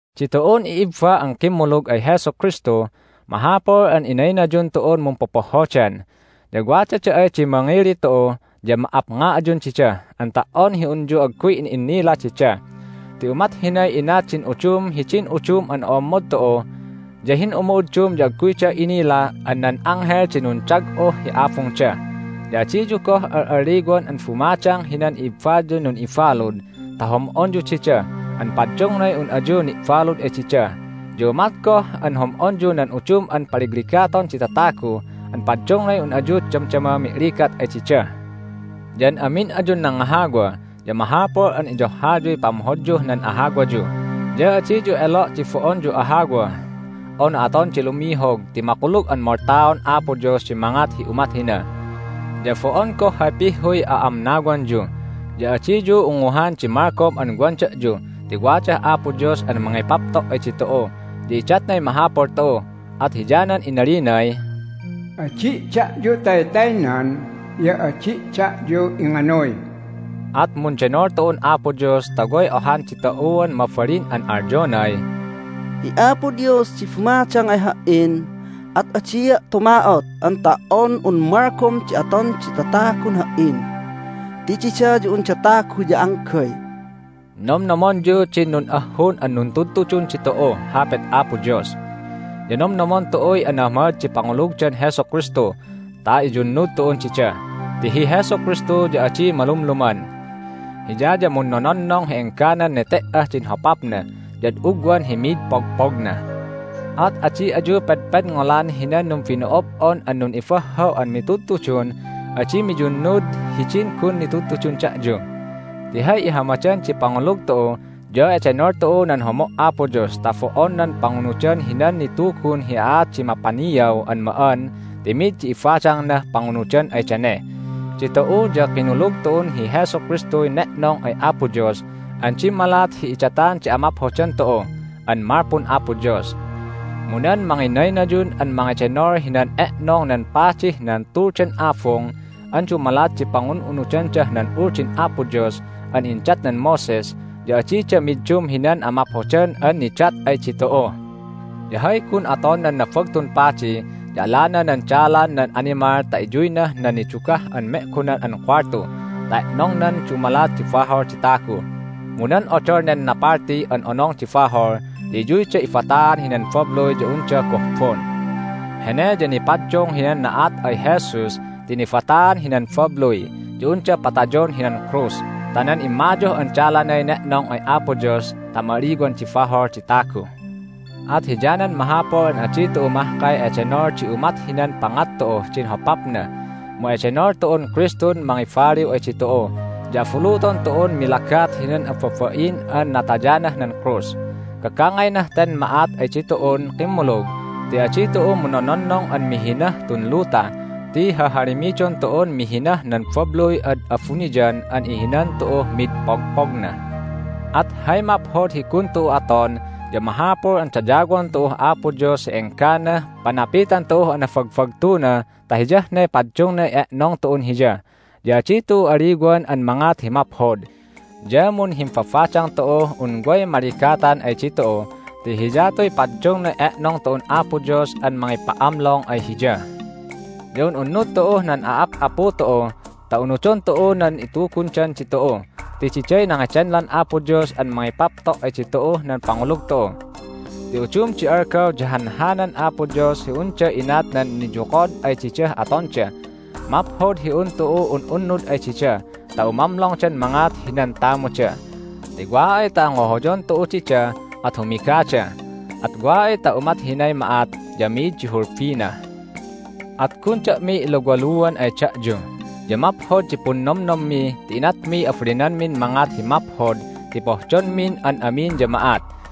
Ditu'un i'ibba an kimmulug ay Jesu Kristu, mahapul an inaynayun tu'un mumpopohhodan. Ya wadada ay di mangili tu'u ya ma"apnga ayun dida an ta"on hi unyu agguy in'innila dida. Ti umat hinay inat din udum hidin udum an o'ommod tu'u. Ya hin'umu'uddum ya agguyda inila an nan anghel di nundag'uh hi abungda! Ya adiyu goh al'alliwan an bumadang hinan i'ibbayun nun'ibalud ta hom'onyu dida an paddungnay un ayu ni'balud ay dida. Ya umat goh an hom'onyu nan udum an paligligaton di tatagu an paddungnay un ayu damdama mi'ligat ay dida. Ya an amin ayun nangahawa ya mahapul an iyohhayuy pamhodyuh nan ahawayu, ya adiyu elo' di bo'onyu ahawa unu aton di lumihog ti makulug an moltaon Apo Dios di mangat hi umat hina. Ya bo'on goh hay pihhuy a'amnawanyu, ya adiyu unguhan di malgom an wan da'yu ti wadah Apo Dios an mangipapto' ay ditu'u, ya idatnay mahapul tu'u, at hiyanan inalinay, "Adi' da'yu taytaynan, ya adi' da'yu inganuy." At mundenol tu'un Apo Dios ta way ohan ditu'uan mabalin an alyonay, "Hi Apo Dios di bumadang ay ha"in, at adia' tuma'ot an ta"on un malgom di aton di tatagun ha"in ti dida ya unda tagu ya anggay." Nomnomonyu din nun'ahhun an nuntudtudun ditu'uh Hapit Apo Dios. Ya nomnomon tu'uy anahamad di pangulugdan Jesu Kristu ta iyunnud tu'un dida. Ti hi Jesu Kristu ya adi malumluman. Hiya ya munnononnong hi engganan nete"ah din hopapna ya ad ugwan hi mid pogpogna. At adi ayu pedpedngolan hinan numbino'ob'on an nun'ibahhaw an mitudtudun adi miyunnud hidin gun nitudtudun da'yu. Ti hay ihamadan di pangulug tu'u ya edenol tu'uh nan homo' Apo Dios ta bo'on nan pangunudan hinan nitugun hi aat di mapaniaw an ma'an ti mi'id di ibadangnah pangunudan ay dane. Ditu'u ya kinulug tu'un hi Jesu Kristuy ne'nong ay Apo Dios an dimmalat hi idatan di amaphodan tu'u an malpun Apo Dios. Mu nan manginaynayun an mangedenol hinan e'nong nan padih nan Tuldan Abung an dumalat di pangun'unudandah nan Uldin Apo Dios an indatnan Moses ya adida middum hinan amaphodan an nidat ay ditu'u. Ya hay gun aton nan Nabagtun Padi ya alana nan dalan nan animal ta iyuynah nan Nidugah an Me'gonan an Kuwaltu ta e'nongnan dumalat di bahol di tagu. Mu nan odol nen napalti an Onong di Bahol ya iyuyda ibataan hinan babluy ya unda gohbon. Hene ya nipaddung hinan na'at ay Jesus ti nibataan hinan babluy ya unda patayon hinan krus ta nan immayuh an dalanay ne'nong ay Apo Dios ta ma'aliwan di bahol di tagu. At hiyanan mahapul an adi tu'u mahkay edenol di umat hinan pangat tu'uh din hopapna, mu edenol tu'un Kristun mangibaliw ay ditu'u, ya abuluton tu'un milagat hinan ababain an natayanah nan krus. Gagangaynah ten ma'at ay ditu'un kimmulug ti adi tu'u munnononnong an mihinah tun luta ti hahalimidon tu'un mihinah nan babluy ad abuniyan an ihinan tu'uh mid pogpogna. At hay maphod hi gun tu'u aton ya mahapul an dayawon tu'uh Apo Dios hi engganah panapitan tu'uh anabagbagtuna ta hiyah ne paddungnay e'nong tu'un Hiya. Ya adi tu'u aliwan an mangat hi maphod, ya munhimbabadang tu'uh un way maligatan ay ditu'u ti hiyatuy paddungnay e'nong tu'un Apo Dios an mangipa'amlong ay Hiya. Ya un'unnud tu'uh nan a'ap'apu tu'u ta unudon tu'u nan itugundan ditu'u ti diday nangedenlan Apo Dios an mangipapto' ay ditu'uh nan pangulug tu'u. Ti udum di algaw ya hanhanan Apo Dios hi unda inat nan niyokod ay didah atonda. Maphod hi un tu'u un'unnud ay dida ta umamlongdan mangat hinan tamuda, ti wa ay ta ngohoyon tu'u dida at humigada. At wa ay ta umat hinay ma'at ya mi'id di hulbina. At gun da'mi iluwaluan ay da'yu. Ya maphod di punnomnommi ti inatmiy abalinanmin mangat hi maphod ti pohdonmin an amin ya ma'at.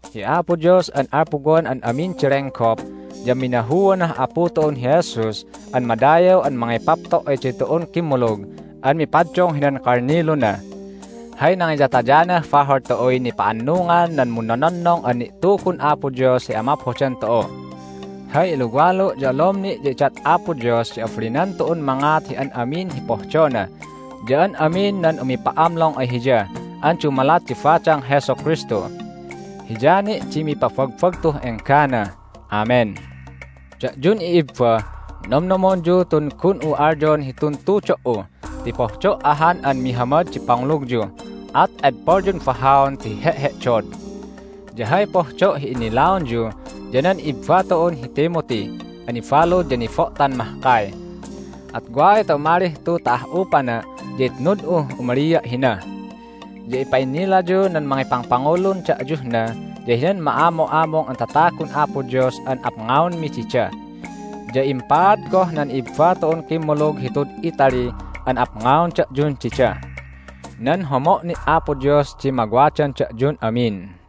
Hi Apo Dios an alpuwan an amin di lenggop ya minahuanah Apu tu'un hi Jesus an madayaw an mangipapto' ay ditu'un kimmulug an mipaddung hinan kalniluna. Hay nangiyatayanah bahol tu'uy nipa'annungan nan munnononnong an ni'tugun Apo Dios hi amaphodan tu'u. Hay iluwalu' ya olom ni' ya idat Apo Dios di abalinan tu'un mangat hi an amin hi pohdona ya an amin nan umipa'amlong ay Hiya an dumalat di badang Jesu Kristu. Hiya ni' di mipabagbagtuh enggana! Amen. Da'yun i'ibba, nomnomonyu tun gun'u alyon hitun tudo"u ti pohdo' ahan an mihamad di pangulugyu, at edpolyun bahaon ti he'he'dod. Ya hay pohdo' hi innilaonyu ya nan ibba tu'un hi Timothy an nibalud ya nibo'tan mahkay. At wa ay ta umalih tu ta ah'upana' ya itnud'uh umalia' hina. Ya ipa'innilayuh nan mangipangpangulun da'yuh na ya hinan ma'amu'amung an tatagun Apo Dios an apngaonmi dida. Ya impaad goh nan i'ibba tu'un kimmulug hitud Italy an apngaon da'yun dida. Nan homo' ni' Apo Dios di mawadan da'yun amin.